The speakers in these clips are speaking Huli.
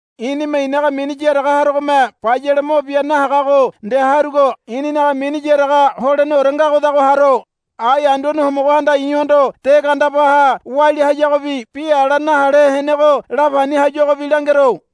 I̱nime i̱naga mini yaraga harogome bayale mo bia nahagago nde harugo i̱ninaga mini yaraga holeneore ngagodago haro. Ai Anduane Homogohanda i̱hondo de gandebaha walia hayagobi bi ala nahale henego la pani hayuagobi langero.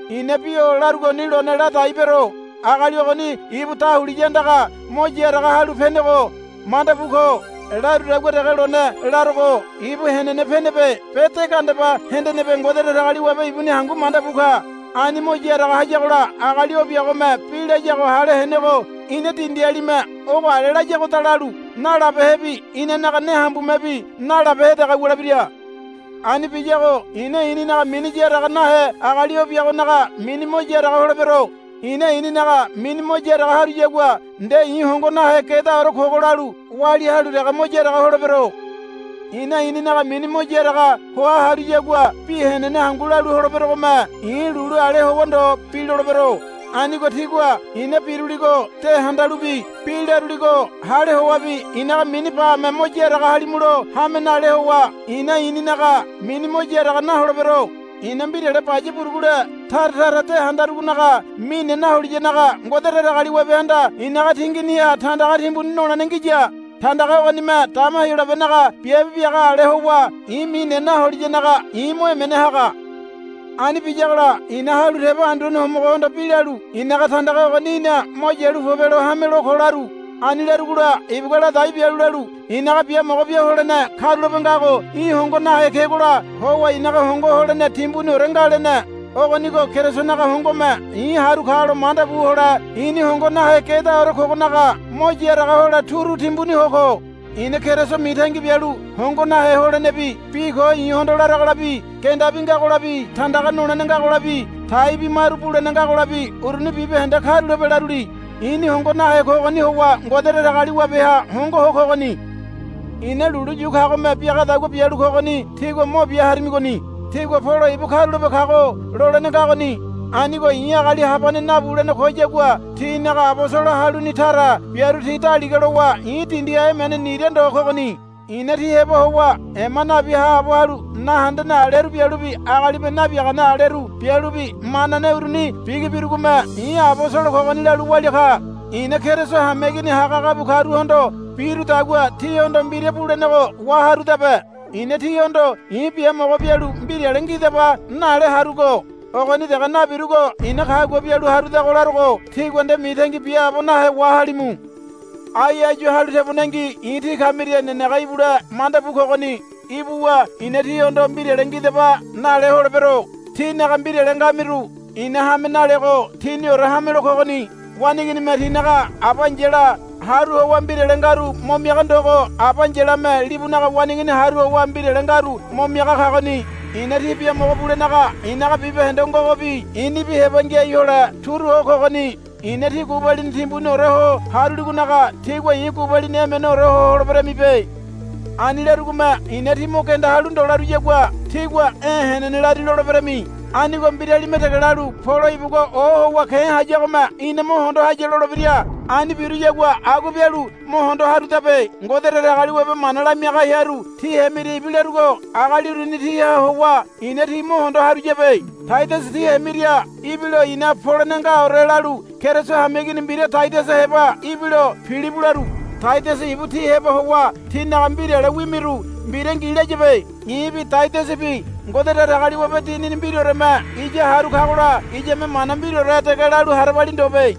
I̱na bi o larugoni lone ladai bero. Agali ogoni ibu dahuliya andaga mo yaraga halu penego manda bu ko. Larudagua dege lone larogo ibu henene penebe be de gandeba hendenebe Ngode Datagaliwabe ibuni hangu manda bu ka. Ani mo yaraga hayagola agali o biagome bi layago hale henego ina dindialime ogo ale layagoda lalu nalabehebi inanaga ne hambumebi nalabehe dege wulebira. Ani biyago i̱na i̱ninaga mini yaraga nahe agali o biagonaga mini mo yaraga holebero. I̱na i̱ninaga mini mo yaraga haruyagua nde i̱ hongo nahe gedaore kogo lalu walia halu dege mo yaraga holebero. I̱na i̱ninaga mini mo yaraga hoa haruyagua bi henene hangu lalu holeberogome i̱ lulu ale howa ndo bi lolebero. Anigo tígua i̱na biruligo de handalubi bi laruligo hale howabi i̱naga mini bame mo yaraga halimulo hame nale howa i̱na i̱ninaga mini mo yaraga naholebero. I̱na mbirale baya burugule tara tara de handarugonaga mine naholiyanaga Ngode Datagaliwabehanda i̱naga tinginiha tandaga timbuni nolene ngiya. Tandaga ogonime dama Heyolabenaga biabe biaga ale howa i̱ mine naholiyanaga i̱ mo emene haga. Ani biyagola i̱na halu tebo Anduane Homogohondo bi lalu, I̱naga tandaga ogoni í̠na mo yalu pobelo hamelo ko, laru. Ani larugola ibugua ladai bialu lalu, I̱naga biamogo bia holene karulape ngago í̠ hongo nahe kegola howa i̱naga hongo holene timbuniore nga, lene. Ogonigo Kerisonaga hongome i̱ haru kalo manda bu hole i̱ni hongo nahe gedaore kogonaga mo yaraga hole turu timbuni ho ko. I̱na Keriso mitangi bialu hongo nahe holenebi bi ko i̱hondo laragolabi gendabi ngagolabi tandaga nolene ngagolabi taibi maru bulene ngagolabi uruni bibahende karulape laruli. I̱ni hongo nahe kogoni howa Ngode Datagaliwabeha hongo ho kogoni. I̱na lulu yu kagome biagadagua bialu kogoni tígua mo bia harimigoni. Tígua, Polo ibu karulape kago, lolene ngagoni. Anigo i̱ agali habane nabulene koyagua tínaga abosolo haluni tara biaru ti daliga lowa i̱ dindiha emene nira ndo kogoni. I̱na tí heba howa ema nabi haabo halu nahendene aleru bialubi agalime nabiagane aleru bialubi manane uruni bigi birugome i̱ abosolo kogoni lalu walia ka. I̱na Keriso hameigini hagahaga bu karuhondo birudagua tíhondo mbira bulenego waharudabe. I̱na tíhondo, I̱ biamogo bialu mbirale ngidaba, nale harugo. Ogoni dege nabirugo i̱na kagua bialu harudago larogo tígua nde mitangi biaabo nahe wahalimu. Ai áyu halu tebonengi i̱ tí kamiria nenege ibule manda bu kogoni. Ibuwa i̱na tíhondo, Mbirale ngidaba, nale holebero. Tínaga mbirale ngamiru i̱na hame nalego tíniore hamelo kogoni. Waneiginime tinaga aba ai̱yala haru howa mbirale ngaru mo miaga ndogo aba ai̱yalame libunaga waneigini haru howa mbirale ngaru mo miaga kagoni. I̱na tí biamogo bulenaga i̱naga bibahende ngogobi i̱nibi heba ngiai hole turu ho kogoni. I̱na tí gubalini timbuniore ho haruligonaga tígua i̱ gubalini emeneore ho holeberamibe. Ani larugome i̱na, Tí mo genda halu ndo, laruyagua tígua, E̱ henene lari, loleberami. Anigo mbiralime dege lalu, Polo ibugua ohowa ke̱ hayagome ina mo hondo haya, lolebira. Ani biruyagua agua bialu mo hondo harudabe. Ngode Datagaliwabe mana lamiaga hearu tí hemiria ibilarugo agali uruni tíha howa i̱na tí mo hondo haruyabe. Taidasa tí hemiria ibilo i̱na, Polene ngaore, lalu Keriso hameigini mbira Taidasa heba ibilo, Pilibu, laru. Taidasa ibu tí heba howa tínaga mbirale wimiru mbira ngi layabe. I̱bi Taidasabi Ngode Datagaliwabe Dinini mbiraoreme iya haru kagola iyame mana mbiraore dege lalu harabali ndobe.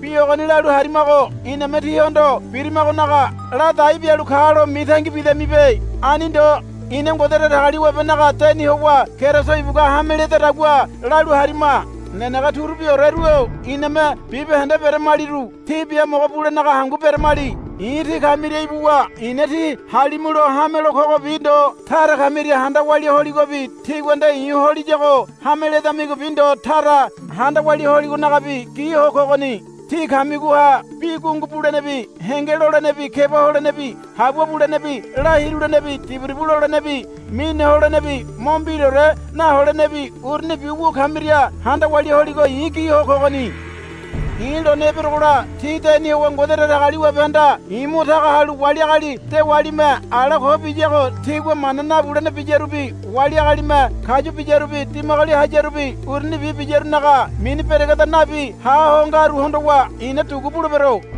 Bi ogoni lalu harimago iname tíhondo birimagonaga ladai bialu kalo mitangi bidamibe. Ani ndo. Ina Ngode Datagaliwabenaga deni howa Keriso ibugua hame ledadagua lalu harima. Nenege turubioreru-o iname bibahende beramaliru tí biamogo bulenaga hangu beramali. I̱ tí kamiria ibuwa i̱na tí halimulo hamelo kogobi ndo tara kamiria handa walia holigobi tígua nde i̱ holiyago hame ledamigobi ndo tara handa walia holigonagabi gi ho kogoni. Tí kamigoha bi gungu bulenebi henge lolenebi keba holenebi habua bulenebi la hirulenebi diburibu lolenebi mine holenebi mo mbiraore naholenebi urunibi wu kamiria handa walia holigo i̱ gi ho kogoni. I̱ lone eberogola tí deni howa Ngode Datagaliwabehanda i̱ mo taga halu wali agali dewalime ala ko biyago tigua mana nabulene biyarubi wali agalime kayu biyarubi dimagoli hayarubi urunibi biyarunaga mini beregeda nabi ha ho ngaru hondowa i̱na dugu bulebero.